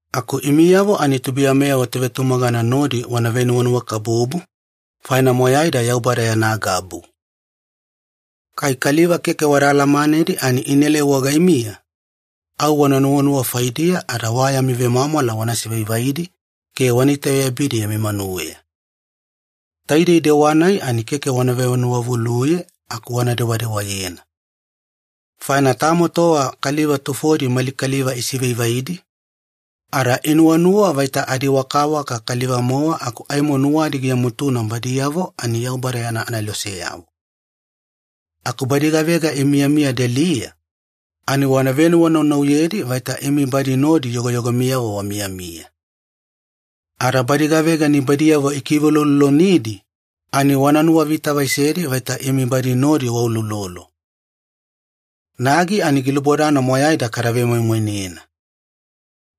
Aku imiyavo ani tubuiyamiyavo tovetumagana nodi wana venuwanuwakabubu, faina moyaida Yaubada yana gabu. Kai kaliva keke wada alamanedi ani inaelai wagaimiya, au wana nuwanuwa faidiya ada wa yami vemwamwala wana sivaivaidi ke wana itaveyabidi yami manuweya. Taidei dewa-nai ani keke wana venuwavuluye aku wana dewadewayena. Faina tamo tova kaliva tufodi mali kaliva isivaivaidi, ada inuwanuwa vaita adiwakawaka kaliva-mowa aku aimo nuwadi giamutuna badiyavo ani Yaubada yana aneloseyavo. Aku badi gavega imiyamiya deliya, ani wana venuwanaunauyedi vaita imi badi nodi yogoyogomiyavo wamiyamiya. Ada badi gavega nibaidiyavo ikiveuloulolonidi, ani wana nuwavitavaisedi vaita imi badi nodi wauloulolo. Nagi ani gilubodana moyaida kada vemoimoinena.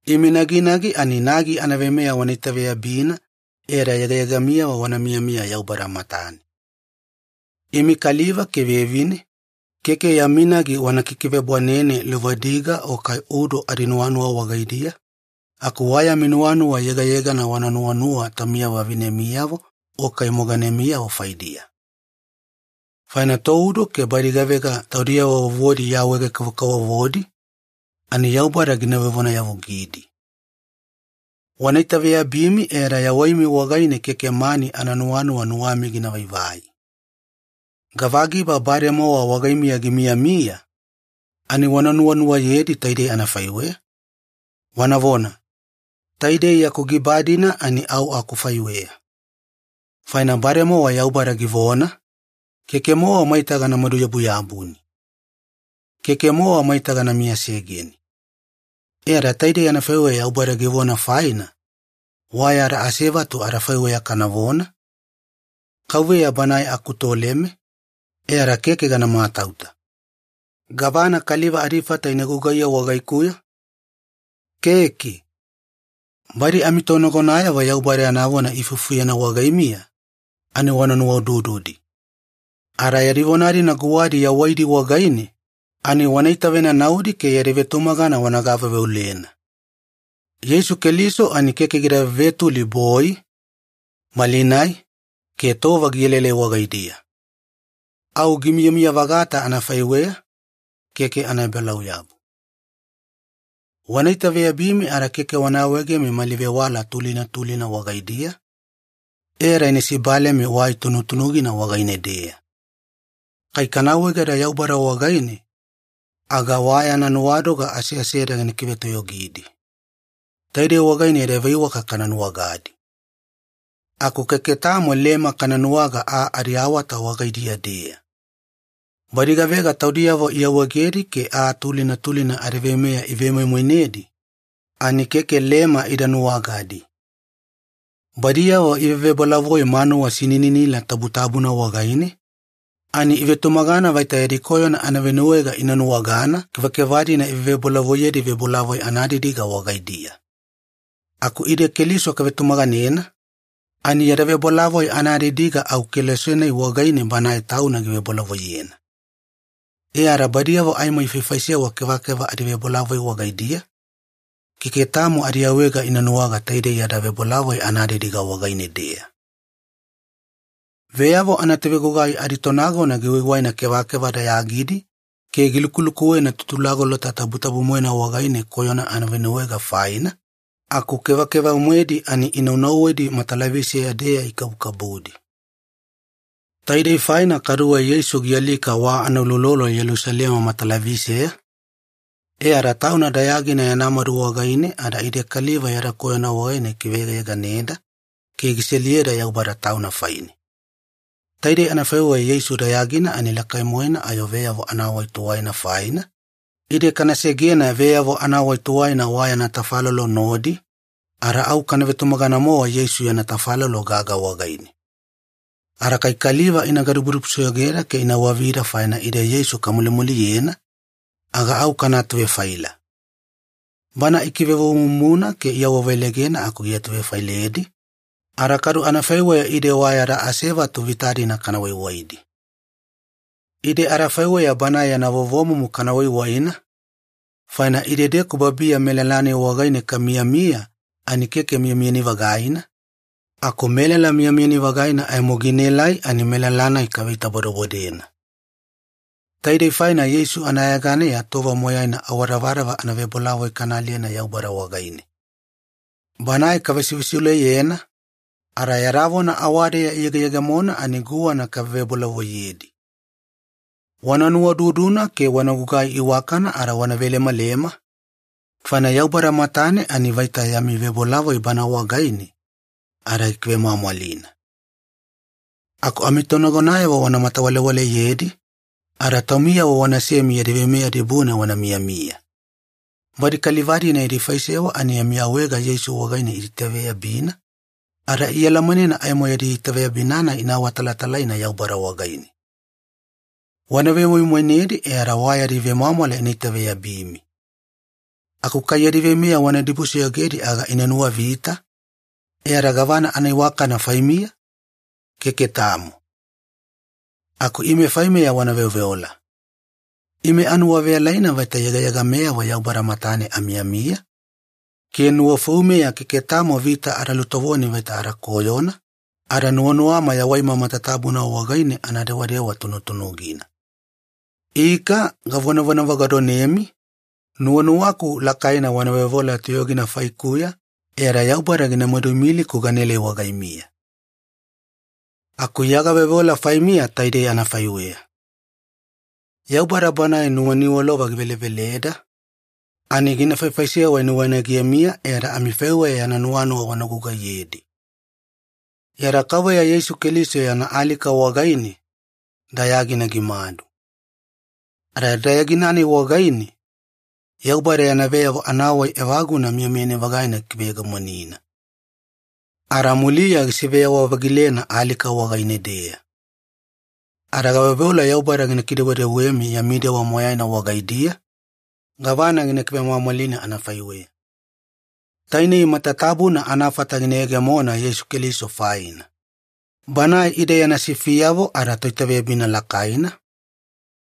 Imi naginagi ani nagi anaveimeya wana itaveyabina, e ada yegayeganimiyavo wana miyamiya Yaubada matane. Imi kaliva ke vevine, keke yami nagi wana kikivebwanene luvadiga o kai udo adinuwanuwa wagaidiya, aku wa yami nuwanuwa yegayegana wana nuwanuwa taumiyavo vavinemiyavo o kai moganemiyavo faidiya. Faina toudo ke badi gavega taudiyavo vovodi iawaege-kavokavovodi, ani Yaubada gina vevonayavugidi. Wana itaveyabimi e ada yawaimi wagaine keke mani ananuwanuwa nuwami gina vaivai. Gavagiba bademowa wagaimiya gimiyamiya, ani wana nuwanuwayedi taidei anafaiweya, wanavona, “Taidei yaku giba-dina ani au akufaiweya.” Faina bademowa Yaubada givona, “Keke-mowa maita gana maduyabuyabuni. Keke-mowa maita gana miyasegeni.” E ada taidei anafaiweya Yaubada givona faina, wa yada asevatu adafaiweya kanavona, “KAUVEYA Banae akutoleme, e ada keke gana matauta. Gavana kaliva adifata ina gugaiye wagaikuya? Keke.” Badi amitonagonayavo Yaubada yana vona iifufuyena wagaimiya, ani wana nuwaudududi. Ada yadi vona-dina guwadi yawaidi wagaine, ani wana itavenanaudi ke yadi vetumagana wana gaveuveulena. Yeisu Keliso ani keke gida vevetuli boi, malinai, ke tova gielaelai wagaidiya. Au gimiyamiya-vagata anafaiweya, keke anaebalauyabu. Wana itaveyabimi ada keke wana awaegemi mali vewala tulina tulina wagaidiya, e ada ina sibalemi wai tunutunugina wagaine-deya. Kai kana awaegeda Yaubada wagaine, aga wa yana nuwadoga aseaseda gina kivetoyogidi. Taidei wagaine yada veiwaka kana nuwagadi. Aku keke tamo lema kana nuwaga aa adiawata wagaidiya-deya. Badi gavega taudiyavo iawaegedi ke aa tulina tulina adiveimeya ivemoimoinedi, ani keke lema ida nuwagadi. Badiyavo ivevebolavoi manuwa sinininila tabutabuna wagaine, ani ivetumagana vaita yadi koyona anavenuwaega ina nuwagana kevakeva-dina ivevebolavoiyedi vebolavoi anadidiga wagaidiya. Aku ide Keliso kavetumaganena, ani yada vebolavoi anadidiga au kelose-nai wagaine Banae Tauna givebolavoiyena. E ada badiyavo aimo ifaifaisewa kevakeva adivebolavoi wagaidiya, keke tamo adiawaega ina nuwaga taidei yada vebolavoi anadidiga wagaine-deya. Veyavo anatovegugai aditonagona giwaiwaina kevakeva dayagidi ke gilukulukuwena Tutulagolota Tabutabu-moena wagaine koyona anavenuwaega faina, aku kevakeva-moedi ani inaunauwedi matalaviseya-deya ikabukabudi. Taidei faina kaduwe Yeisu gialika wa anauloulolo Yelusalema matalaviseya, e ada Tauna dayagina yana madu wagaine ada ide kaliva yada koyona wagaine gikiveyegayeganeda ke giseliyeda Yaubada Tauna faine. Taide anafaiweya Yeisu dayagina ani lakai-moena ayo veyavo anawai tuwaina faina, ide kana segena veyavo anawai tuwaina wa yana tafalolo nodi, ada au kana vetumagana-mowa Yeisu yana tafalolo gaga wagaine. Ada kai kaliva ina gadibudibusoyogeda ke ina wavida faina ide Yeisu kamulimuliyena, aga au kana atuvefaila. Banae ikivevovomumuna ke iawaveleigena aku giatuvefailedi, ada kadu anafaiweya ide wa yada asevatu vita-dina kana waiwaidi. Ide adafaiweya Banae yana vovomumu kana waiwaina, faina idedeku babiya melala-nai wagaine kamiyamiya ani keke miyamiyani-vagaina, aku melala miyamiyani-vagaina aimo ginaelai ani melala-nai kaveitabodebodena. Taidei faina Yeisu anayeganeya tova moyaina awadavadava anavebolavoi kana aliyena Yaubada wagaine. Banae kavesivesiuleyena, ada yada vona awadeya iyegeyegemona ani guwana kavevebolavoiyedi. Wana nuwaududuna ke wana gugai iwakana ada wana velemalema, faina Yaubada matane ani ina vaita yami vebolavoi Bana wagaine, ada gikivemwamwalina. Aku amitonagonayavo wana matawalewaleyedi, ada taumiyavo wanasemi yadi veimeya dibune wana miyamiya. Badi kaliva-dina yadi faisewa ani yami awaega Yeisu wagaine iitaitaveyabina, ada ialamanena aimo yadi itaveyabina-nai ina awatalatalaina Yaubada wagaine. Wana vemoimoinedi e ada wa yadi vemwamwala ina itaveyabimi. Aku kai yadi veimeya wana dibusoyogedi aga ina nuwavita, e ada gavana anaiwakana faimiya? Keke tamo. Aku ime faimeya wana veoveola. Ime anuwaveyalaina vaita yegayegameyavo Yaubada matane amiyamiya, ke nuwafoumeya keke tamo vita ada lutovoni vaita ada koyona, ada nuwanuwama yawaima matatabuna wagaine ana dewadewa tunutunugina. Ika, gavonavagadonemi, nuwanuwaku lakaina wana veoveola toyogina faikuya e ada Yaubada gina maduimiliku ganaelai wagaimiya. Aku Iya gaveoveola faimiya taidei anafaiweya. Yaubada Banae nuwaniwalova giveleveleda, ani gina faifaisewa nuwainagemiya e ada amifaiweya yana nuwanuwa wana gugaiyedi. Yada Kauveya Yeisu Keliso yana alika wagaine, dayagina gimadu. Ada dayagina-nai wagaine, Yaubada yana veyavo anawai evaguna miyamiyani-vagaina gikiveyegemonina. Ada muliya gisiveyawa-vagilena alika wagaine-deya. Ada gaveoveola Yaubada gina kidewedewemi yami dewa moyaina wagaidiya, gavana gina kivemwamwalina anafaiweya. Tainei matatabuna anafata gina yegemona Yeisu Keliso faina, Banae ide yana sifiyavo adaToitaveyabina lakaina,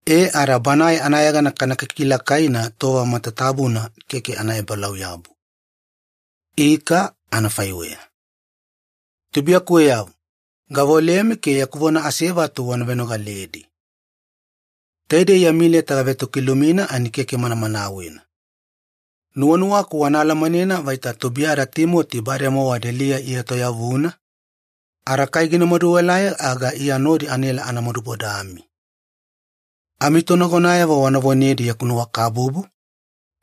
e ada Banae anayegana kana kikilakaina tova matatabuna keke anaebalauyabu. Ika anafaiweya. Tubuiyakuweyavo, gaveolemi ke yaku vona asevatu wana venogaledi. Taidei yami leta gavetokilumina ani keke manamanawena. Nuwanuwaku wana alamanena vaita tubuiyada Timoti bademowa deliya ietoyavuna, ada kai gina maduelai aga Iya nodi anaela ana madubodami. Amitonagonayavo wana vonedi yaku nuwakabubu,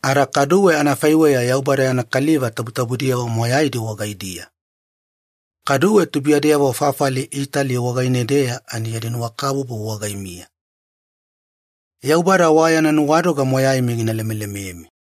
ada kaduwe anafaiweya Yaubada yana kaliva tabutabudiyavo moyaidi wagaidiya. Kaduwe tubuiyadeyavo fafali Itali wagaine-deya ani yadi nuwakabubu wagaimiya. Yaubada wa yana nuwadoga moyaimi gina lemelememi.